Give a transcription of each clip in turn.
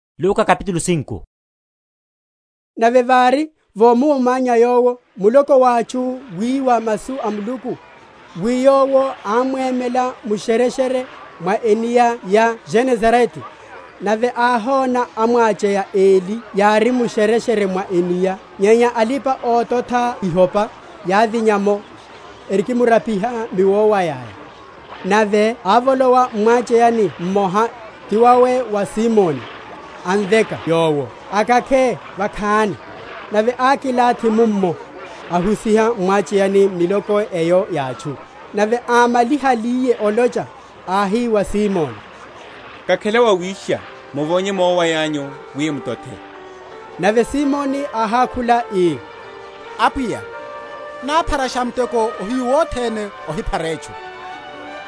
Ophariwa wa ihopa sinchipale. Óhuserya ópacherya. Nave vári, vomuwomanya Yowo muloko wa atchu, wiwa masu a Muluku, wi Yowo ámwemela mu’shereshere mwa enia ya Genesarete; nave áhona amwacheya eli yári mu’shereshere mwa enia: nyenya alipa‐ototha ihopa yávinya’mo, erikimrapiha miowaya’ya. Nave ávolowa m’mwacheyani mmoha, ti wawe wa Simoni, amveka yowo akakhe vakhani. Nave ákilathi mummo, ahusiha m’mwacheyani miloko eyo ya atchu. Nave ámálihaliye olocha, áhi wa Simoni, Kakhela wa wisha, muvonye miowaya’nyu wi mutothe. Nave Simoni áhákhula, ii, Apwiya, nápharasha muteko ohiyu wothene ohiphara etchu,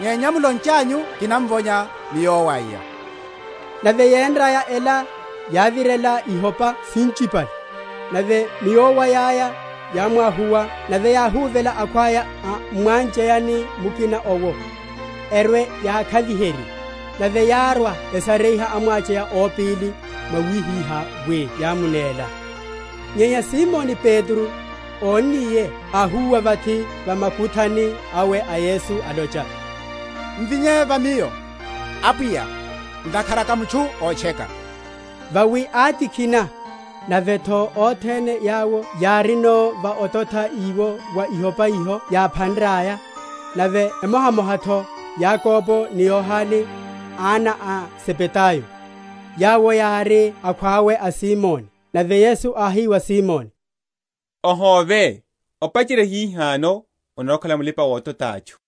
nyenya mulonchanyu kina?-?vonya miowaya. Nave yénraya ela, yávirela ihopa sinchipale; nave miowaya’ya yámwáhuwa; nave yáhúvela akhwaya a m’mwacheyani mukina owo, erwe yákhaviherye. Nave yárwa, esariha amwacheya ópili, mwawihihá wi yámunéla. Nyenya Simoni Petro, ónniye, áhúwa vathi va makuthani awe a Yesu, alocha, M’vinye va miyo, Apwiya, ntakhara ká mutchu ótcheka. Vawi átikhina, nave’tho othene yawo yárino, va ototha iwo wa ihopa iho yáphanraya; nave emohamoha’tho Yakobo ni Yohane, ana a Zebedayo, yawo yári akhwawe a Simoni. Nave Yesu áhi wa Simoni, Ohóve, opacherya hihano onarwa‐okhala mulipa‐ototha atchu.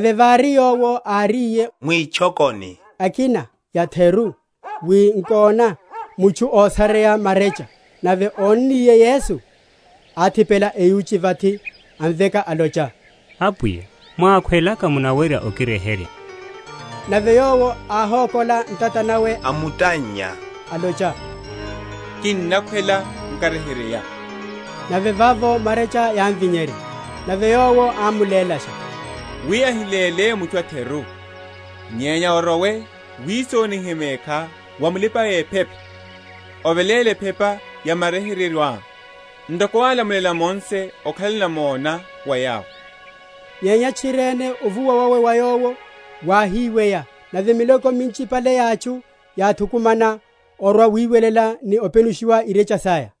Nave vári, Yowo áriye mwitchokoni ekina ya’theru, wi nkona, mutchu ósareya marecha; nave ónniye Yesu, áthipela eyuchi vathi, amveka, alocha, Apwiya, mwákhwelaka munawerya okiryeherya. Nave Yowo áhókola ntata nawe, amutannya, alocha, Kinnakhwela, nkaryeheryeya. Nave vavo marccha yámvinyerya. Nave Yowo ámulélasha, wi ahiléle mutchu a’theru; nyenya orowe wisonihe mekhá wa mulipa‐ephepa, oveléle ephepa ya wa maryeheryeyo awá, ntoko álamulela Mose, okhale namona wa yawo. Nyenya tchiriene ovuwa wawe wa Yowo wáhiweya: nave miloko minchipale ya atchu yáthukumana orwa‐wiwelela, ni openushiwa irecha saya.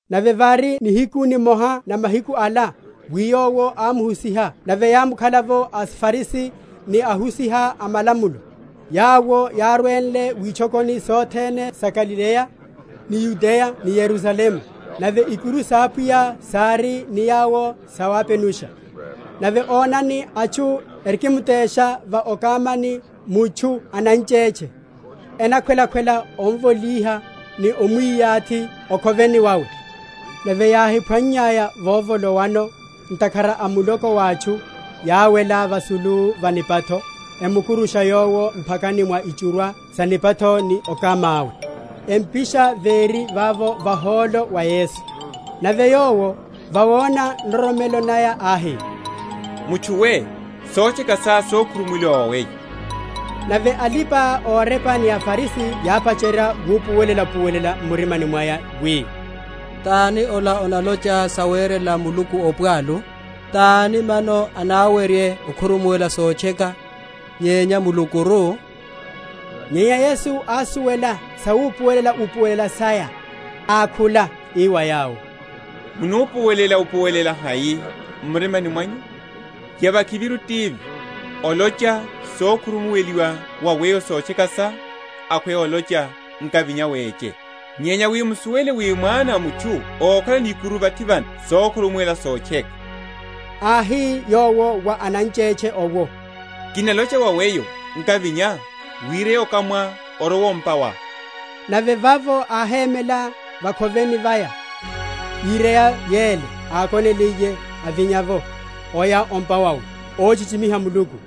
Nave vári nihiku nimoha na mahiku ala, wi Yowo ámuhusiha; nave yámukhala’vo aFarisi ni ahusiha a malamulo, yawo yárwenle witchokoni sothene sa Galileya, ni Yudeya ni Yerusalemu: nave ikuru sa Apwiya sári ni Yowo sawapenusha. Nave onani, atchu erikimtesha va okamani mutchu ananchetche; enakhwela‐khwela omvolíha, ni omwi?-?yathi o’khoveni wawe. Nave yáhiphwannyaya vovolowano, ntakhara a muloko wa atchu, yáwela vasulu va nipatho, emukurusha yowo m’phakani mwa ichurwa sa nipatho ni okama’we, empisha véri vavo vahólo va Yesu. Nave Yowo, vawona nroromelo naya, áhi, Mutchu we, sotcheka sá sokhurumuweliwa wa weyo. Nave alipa‐orepa ni aFarisi, yápacherya wupuwelela?-?upuwelela m’murimani mwaya, wi, Tani ola analocha sawcrela Muluku opwalu? Tani mano anáwerye okhurumuwela sotcheka, nyenya Mulukuru? Nyenya Yesu ásuwela sawupuwelela‐upuwelela saya, ákhula, ii wa yawo, Munupuwelela‐upuwelela hai m’mirimani mwanyu? Yavakhiviru tivi, olocha, Sokhurumuweliwa wa weyo sotcheka sá; akhweya olocha, Nkavinya, weche? Nyenya wi musuwele wi Mwana a mutchu okhalano ikuru vathi vano sokhurumuwela sotcheka, (áhi Yowo wa ananchetche owo,) Kinalocha wa weyo, Nkavinya, wireye okamá, orowe o’mpa wá. Nave vavo áhémela va’khoveni vaya, íreya yele ákonenliye, avinya’vo, oya o’mpa wawe, óchichimiha Muluku.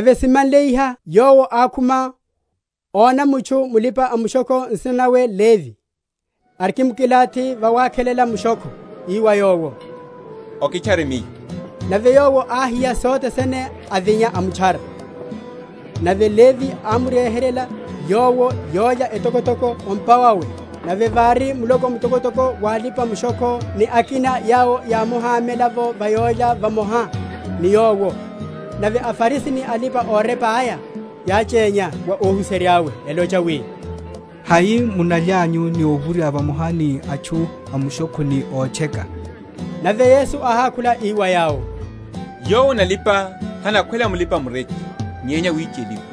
Nave simanle iha Yowo ákhuma, óna mutchu mulipa‐mushokho, nsina nawe Levi, arikimkilathi vawakhelela mushokho, ii wa yowo, Okitchare Miyo. Nave yowo áhiya sothe sene, avinya, amutchara. Nave Levi ámryeheryela Yowo yólya etokotoko o’mpa wawe; nave vári muloko mtokotoko wa alipa‐mushokho, ni akina yawo yámuhámela va yólya vamoha ni Yowo. Nave aFarisi ni alipa‐orepa aya yáchénya wa óhuserya’we, elocha, wi, Hai munalyanyu ni owurya vamoha ni atchu amushokho ni ótcheka? Nave Yesu áhákhula, ii wa yawo, Yowo analipa hanakhwela mulipa‐mureche; nyenya awicheliwa.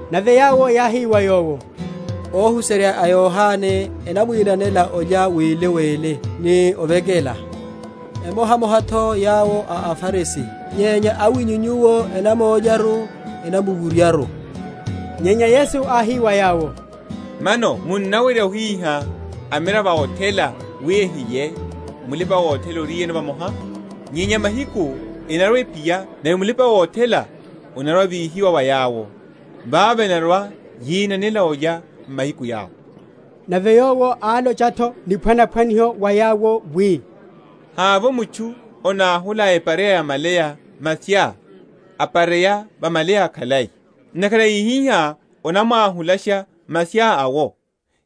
Nave yawo yáhi wa Yowo, Óhuserya a Yohane enamwinanela olya wili wili, ni ovekela; emohamoha’tho yawo a aFarisi; nyenya awinyu Nyuwo enamólyaru, enamuwuryaru. Nyenya Yesu áhi wa yawo, Mano munawerya ohíha amiravo a othela wi ehilye, mulipa‐othela oriyeno vamoha? Nyenya mahiku enarwa‐ephiya; nave mulipa‐othela anarwa‐avíhiwa wa yawo, vavo enarwa‐yinanela olya m’mahiku yawo. Nave Yowo álocha’tho niphwanaphwaniho wa yawo, wi, Havovo mutchu anáhula epareya ya malaya maphya, apareya va malaya akhalai; ntakhara íhiha, anamwahulasha maphya’wo,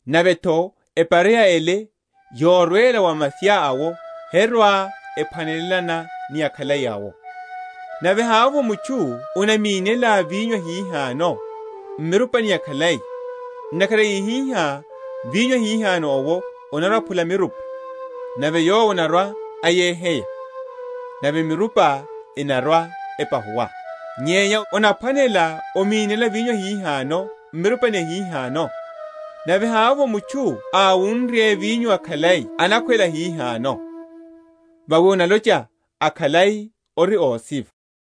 nave’tho epareya ele yorwela wa maphya’wo herwa‐ephwanelelana ni akhalai awo. Nave havovo mutchu anamínela vinyo ahihano m’mirupani yakhalai; ntakhara íhiha, vinyo ahihano’wo anarwa‐aphula mirupa, nave yowo anarwa‐ayeheya, nave mirupa enarwa‐epahuwa. Nyenya onaphwanela omínela vinyo ahihano m’mirupani yahihano. Nave havovo mutchu awunrye vinyo akhalai anakhwela ahihano: vawi analocha, Akhalai ori ósiva.